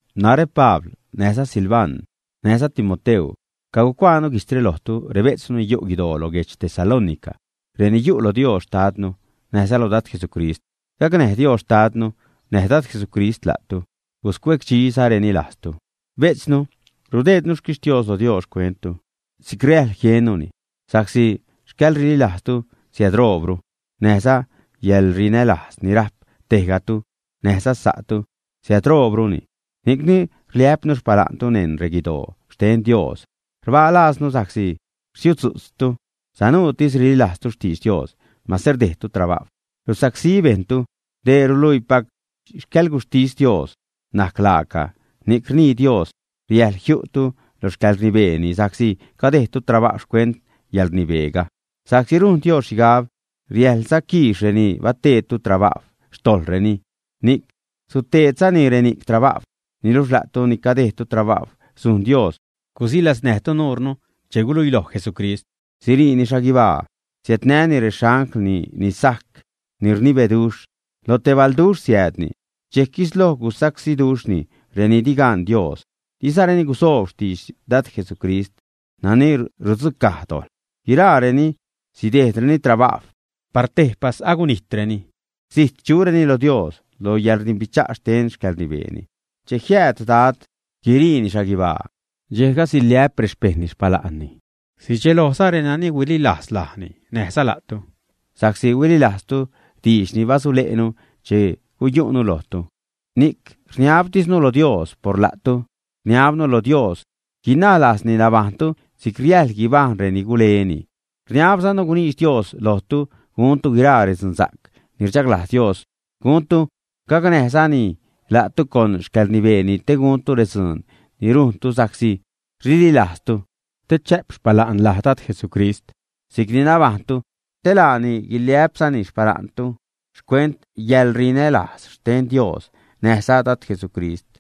Narä Pabl, näjza Silvan näjza Timoteu, cacuaanu guijtzre lojtu, rebejtznu ni yu' guidoo lo guedx Tesalónica, reni yu' lo Dios Xtadnu näjza lo Dad Jesucrist. Gacnäj Dios Xtadnu näj Dad Jesucrist la'tu, guscuecdxizareni lajztu. Bejtznu, rudeednu xquixtios lo Dios xcuenttu, si'c riäjḻ jiennuni, sa'csi xcäḻrililajztu siädroobru, näjza yäḻrinälajz ni rajp tejgatu näjza sa'tu siädroobruni. Ni'cni rliä'pnu xpala'ntu neṉ reguidoo xten Dios. Rbaa lajznu sa'csi rsiudzu'tztu sanuutis rililajztu xtidx Dios mase rdejdtu trabajw, rusacsí bejṉtu. Dee ruluiipac xcäḻguxhtis Dios najc laaca, ni'c rnii Dios riäjḻ jiu'tu lo xcäḻrnibeeni sa'csi cadejdtu trabajw xcuent yäḻrnibeega. Sa'csi rujn Dios xhigab riäjḻza quiix reni bateedtu trabajw xtojḻreni, ni'c suteedzani reni'c trabajw. Niluxh la'tu ni cadejdtu trabajw, sujn Dios gusilaznäjtu nuure che guluiiloj Jesucrist, siriini xhaguibaa siädnäjni rexanglni ni sajc, ni rnibeduxh. Lo te balduxh siäädni, dxejc guisloj susacsíduxhni reni di gaṉ Dios, dizareni gusoob xtidx Dad Jesucrist nani rudzucaj dojḻ. Guiraareni sidejdreni trabajw, par tejpas agunijtreni, zijt chureni lo Dios, lo yäḻrdimbicha' xten xcäḻrnibeeni. Che jiääd Dad guiriini xhaguibaa, dxejga siliä'p rexpejṉni xpala'nni, sidxelojza renani huililajz laani näjza la'tu, sa'csi huililajztu diidx ni basule'nu che guyu'nu lojtu. Ni'c rniabtisnu lo Dios por la'tu, rniabnu lo Dios guinaj lajzni nabajṉtu si'c riäjḻ guibajṉ reni guleni. Rniabzanu guniidx Dios lojtu guntu guiraa redzunsa'c ni rchaglajz Dios guntu, gacnäjzani la'tu con xcäḻrnibeeni te guntu redzuun ni rujntu sa'csi rililajztu. Te chä'p xpala'n laj Dad Jesucrist si'cni nabajṉtu, te laani guiliä'pzani xpala'ntu, xcuent yäḻrinälajz xten Dios näjza Dad Jesucrist.